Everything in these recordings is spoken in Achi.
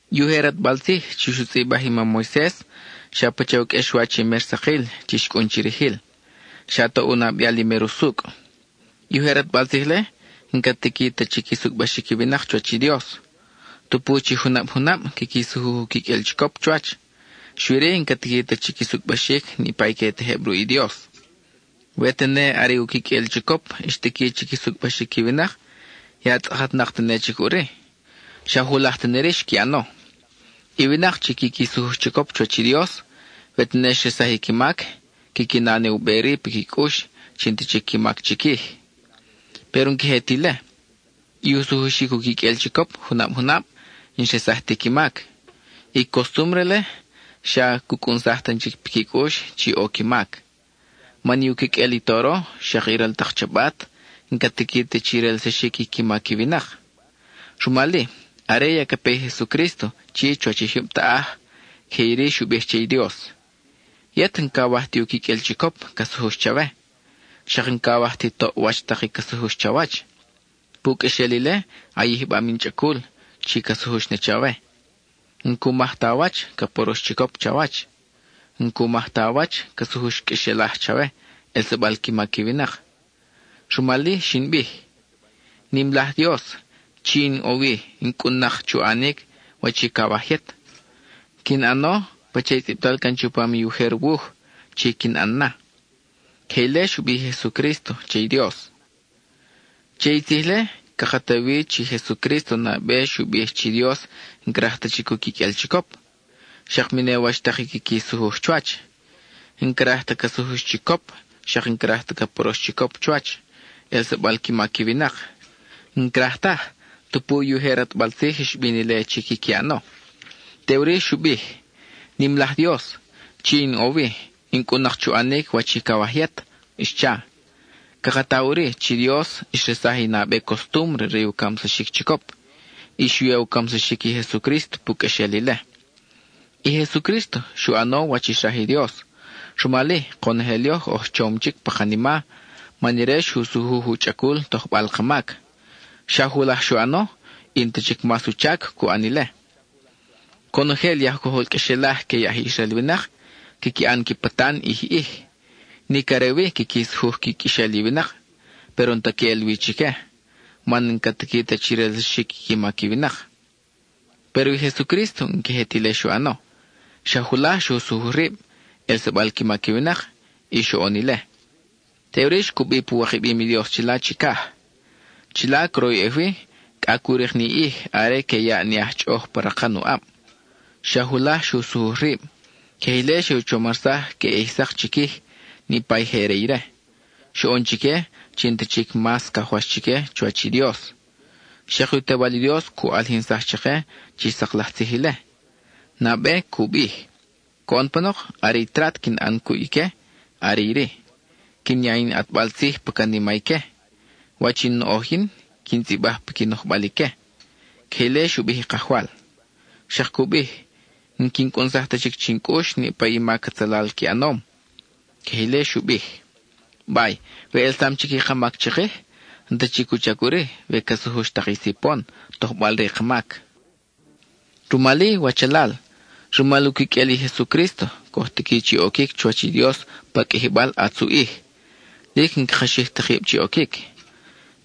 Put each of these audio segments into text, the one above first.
I ujer ʼatbal tzij chi xu tzʼibaj i mam Moises xa pacha u qʼuexwach i mer sakil chi xcʼun chirijil; xa toʼ u nabeal i mer usucʼ. I ujer ʼatbal tzij-le n-ca tiqui ta chi qui sucʼbaxic i winak chuwach i Dios. Tupu chi junab junab quiqui sujuj u quiqʼuel chicop chuwach, xui-ri n-ca tiqui ta chi qui sucʼbaxic niʼpa i que tejeb ruʼ i Dios. We tene are u quiqʼuel chicop xtiqui chi qui sucʼbaxic i winak, ya tzʼakatnak tene chic ʼuri, xa julaj tene-ri xqui ʼano. I winak chi quiqui sujuj chicop chuwach i Dios, we tene xresaj i qui mac, quiqui na ne u be-ri piqui cʼux chi n-ta chic qui mac chiquij. Péro n-queje ti ile. I u sujuxic u quiqʼuel chicop junab junab, n-xresaj ti qui mac; i costúmbre-le xa cu cʼunsaj tan chic piqui cʼux chi ʼo qui mac. Man i u quiqʼuel i toro, xak i ral tak chabat n-ca tiqui ta chi relsaxic i qui mac i winak. Rumal-i, are ya ca pe i Jesucrísto chi chuwach i jyub taʼaj, queje iri xu bij che i Dios: Yet n-cawaj ti u quiqʼuel chicop ca sujux chawe; xak n-cawaj ti toʼ wach tak i ca sujux chawach. Pu qʼuexel ile a yijbam in chʼacul (chi ca sujux na chawe). N-cu maj ta a wach ca porox chicop chawach; n-cu maj ta a wach ca sujux qʼuexelaj chawe, ʼelsabal qui mac i winak. Rumal-i xin bij: “Nim laj Dios, chi in ʼo wi, in cʼun-nak chu ʼanic wach i cawaj yet; quin ʼano pacha i tzʼibtal can chupam i ujer wuj chi quin ʼan na.” (Queje ile xu bij i Jesucrísto che i Dios.) Che i tzij-le, caka ta wi chi Jesucrísto nabe xu bij chi i Dios n-craj ta chic u quiqʼuel chicop, xak mi ne wach tak i quiqui sujuj chuwach. N-craj ta ca sujux chicop, xak n-craj ta ca porox chicop chuwach, ʼelsabal qui mac i winak. N-craj taj, tupu i ujer ʼatbal tzij xbin ile chi quiqui ʼano. Teʼuri xu bij: “Nim laj Dios, chi in ʼo wi, in cʼun-nak chu ʼanic wach i cawaj yet,” xcha. Caka ta ʼuri chi i Dios xresaj i nabe costúmbre re u camsaxic chicop, y xu ya u camsaxic i Jesucrísto pu qʼuexel ile. I Jesucrísto xu ʼano wach i xraj i Dios. Rumal-i konojel yoj oj chom chic pa kanima, man ire xu sujuj u chʼacul tojbal ka mac. Xa julaj xu ʼano, y n-ta chic mas u chac cu ʼan ile. Conojel i aj cojol qʼuexelaj que i aj Israel winak, quiqui ʼan qui patan ʼij ʼij. Nic are wi quiqui sujuj qui quexel i winak, péro n-ta queʼel wi chique, man n-ca tiqui ta chi relsaxic qui mac i winak. Péro i Jesucrísto n-queje ti ile xu ʼano. Xa julaj xu sujuj rib, ʼelsabal qui mac i winak, y xoʼon ile. Teʼuri xcubi pu wikabim i Dios chila chicaj. Chila croyʼej wi, cʼa cu rik ni ʼij are que yaʼ ni aj chʼoʼoj pa rakan uʼab. Xa julaj xu sujuj rib; queje ile xe u chomarsaj queʼe ʼij sak chiquij niʼpa i je re ire. Xoʼon chique chi n-ta chic mas cajwax chique chuwach i Dios. Xak u Tewal i Dios cu ʼalijinsaj chake chi sak laj tzij ile. Nabe, cu bij: Coʼon panok are i trat quin ʼan cuʼ ique are iri: quin ya in ʼatbal tzij pa canima ique; wach in noʼoj yin, quin tzʼibaj piqui nojbal ique. (Queje ile xu bij i Kajwal.) Xak cu bij: N-quin cʼunsaj ta chic chin cʼux niʼpa i mac atzalal qui ʼanom. (Queje ile xu bij.) Bay, we ʼelsam chic i ka mac chikij, n-ta chic u chac ʼuri we ca sujux tak i sipon, tojbal re i ka mac. Rumal-i, wachalal, rumal u quiqʼuel i Jesucrísto, coj tiqui chi oquic chuwach i Dios pa Qʼuijibal ʼatz u ʼij, lic n-caka xij ta kib chi oquic.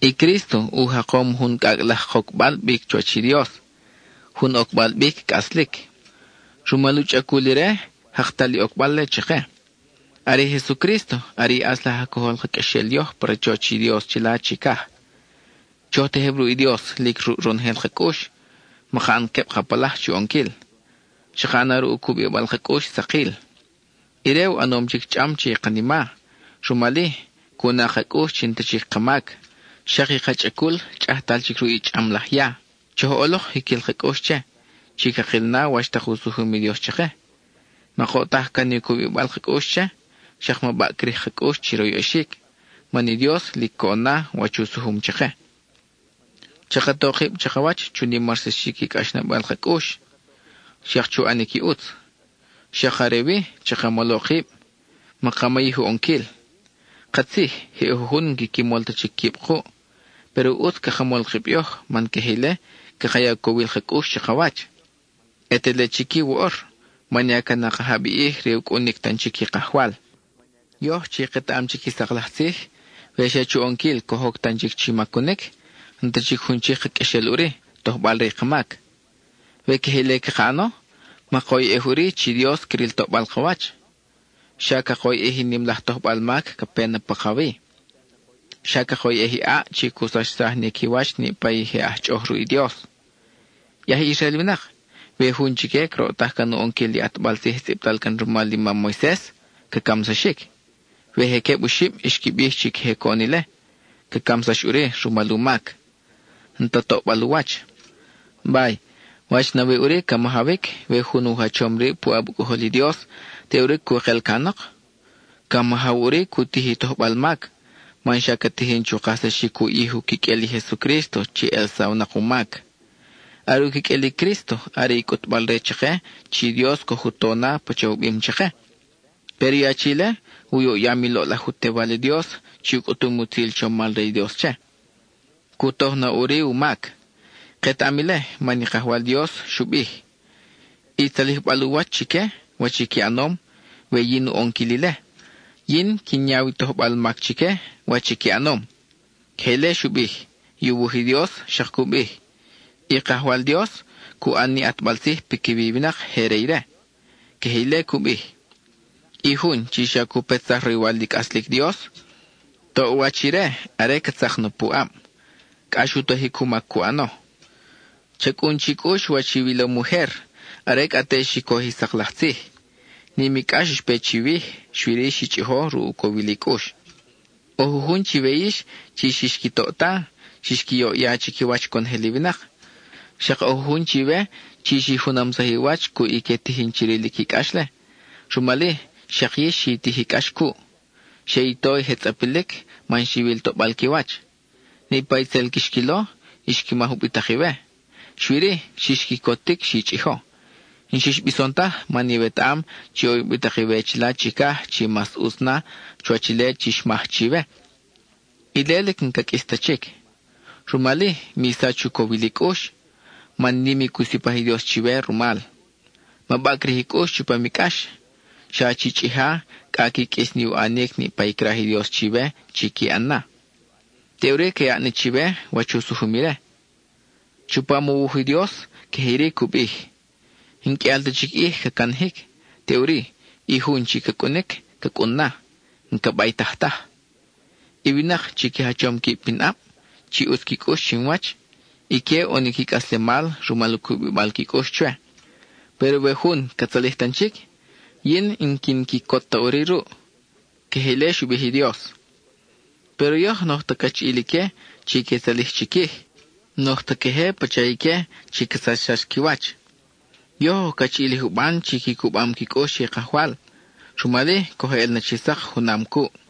I Crísto u jakom jun cʼacʼ laj kocbal bic chuwach i Dios, jun ocbal bic cʼaslic. Rumal u chʼacul ire, jaktal i ocbal-le chake. Are i Jesucrísto are i ʼatz laj aj cojol ka qʼuexel yoj pa rachoch i Dios chila chicaj. Choj tejeb ruʼ i Dios lic ruʼ ronojel ka cʼux; maka ʼan queb ka palaj chu ʼonquil, chaka ʼana ruʼ u cubibal ka cʼux sakil. Ire u ʼanom chic chʼam che i kanima, rumal-i, cu na ka cʼux chi n-ta chic ka mac; xak i ka chʼacul chʼajtal chic ruʼ i chʼam laj ya. Choj ʼolok jiquil ka cʼux che, chi cakil na wach tak u sujum i Dios chake. Makoʼtaj can i cubibal ka cʼux che, xak ma baʼcrij ka cʼux chi royʼexic, man i Dios lic coʼon na wach u sujum chake. Chaka to kib chakawach chu nimarsaxic i cʼaxnabal ka cʼux, xak chu ʼanic i ʼutz. Xak are wi, chaka molo kib; maka mayij u ʼonquil. Katzij, je ʼo jujun n-quiqui mol ta chic quib kuʼ. Péro ʼutz caka mol kib yoj man queje ile caka ya u cowil ka cʼux chakawach, ʼe te le chic-i woʼor, man ya ca nakajab i ʼij re u cʼunic tan chic i Kajwal. Yoj chi ketaʼam chic i sak laj tzij, we xa chu ʼonquil coj oc tan chic chi macunic, n-ta chic jun chic ka qʼuexel ʼuri, tojbal re i ka mac. We queje ile caka ʼano, makoyʼej ʼuri chi Dios cril toʼbal ka wach; xa cakoyʼej i nim laj tojbal mac ca pe na pakawi. Xa cakoyʼej i ʼaʼ chi cu sachsaj ni qui wach niʼpa i je aj chʼoʼoj ruʼ i Dios. I aj Israel winak, we jun chique croʼtaj can u ʼonquil i ʼatbal tzij tzʼibtal can rumal i mam Moises, ca camsaxic. We je queb oxib xqui bij chi queje oʼonom ile, ca camsax ʼuri rumal u mac. N-ta toʼbal u wach. Bay ¿wach nawi ʼuri ca majawic we jun u jachom rib puʼab u Cʼojol i Dios, teʼuri cu kel canok? Ca majaw ʼuri cu tij i tojbal mac, man xa ca tijin chu kajsaxic u ʼij u quiqʼuel i Jesucrísto chi elsawnak u mac. Are u quiqʼuel i Crísto are i cʼutbal-re chake chi i Dios coj u to na pacha u bim chake. Péro i achi-le u yoʼyam i loʼlaj u Tewal i Dios chi u cʼutum i utzil chomal re i Dios che. Cu toj na ʼuri u mac. Ketaʼam ile man i Kajwal Dios xu bij: “I tzalijbal u wach chique, wach i qui ʼanom, we-yin u ʼonquil ile. Yin quin yaw i tojbal mac chique, wach i qui ʼanom.” Queje ile xu bij; i u wuj i Dios xak cu bij; “I Kajwal Dios cu ʼan ni ʼatbal tzij piquiwi i winak je re ire.” Queje ile cu bij. I jun chi xa cu petsaj roywal i cʼaslic Dios ¡toʼwach ire are ca tzak na pu ʼab! (Cʼax u tojic u mac cu ʼano.) Cha cʼun chi cʼux wach iwilom ujer, are cʼa te xi coj i sak laj tzij; nim i cʼax xpe chiwij, xui-ri xi chʼijo ruʼ u cowil i cʼux. ʼO jujun chiwe yix chi xix qui toʼta, xix qui yoʼya chiquiwach conojel i winak. Xak ʼo jujun chiwe chi xi junamsaj i wach cuʼ i que tijin chi rilic i cʼax-le; rumal-i xak yix xi tij i cʼax cuʼ. Xe i to i je tzʼapilic man xiwil toʼbal qui wach. Niʼpa i tzel quix quilo xqui maj ubitak iwe; xui-ri, xix quicotic xi chʼijo. N-xix bison taj man iwetaʼam chi ʼo ubitak iwe chila chicaj chi mas ʼutz na chuwach ile chi xmaj chiwe; ile lic n-ca qʼuis ta chic. Rumal-i, mi sach u cowil i cʼux, man nim i cu sipaj i Dios chiwe rumal. Ma baʼcrij i cʼux chupam i cʼax, xa chi chʼija cʼa qui qʼuis ni u ʼanic niʼpa i craj i Dios chiwe chi qui ʼan na. Teʼuri ca yaʼ na chiwe wach u sujum ire. Chupam u wuj i Dios, queje iri cu bij: N-qʼuial ta chic ʼij ca canajic, teʼuri i jun chi ca cʼunic, ca cʼun na; n-ca baytaj taj. I winak chi qui jachom quib pinʼab, chi ʼutz qui cʼux chinwach, ique ʼo ni qui cʼaslemal rumal u cubibal qui cʼux chwe. Péro we jun ca tzalij tan chic, yin n-quin quicot ta ʼuri ruʼ. (Queje ile cu bij i Dios.) Péro yoj n-oj ta cachiʼil ique chi que tzalij chiquij; n-oj ta queje pacha ique chi ca sachsax qui wach. Yoj oj cachiʼil i juban chi qui cubam qui cʼux che i Kajwal, rumal-i coj ʼel na chi sak junam cuʼ.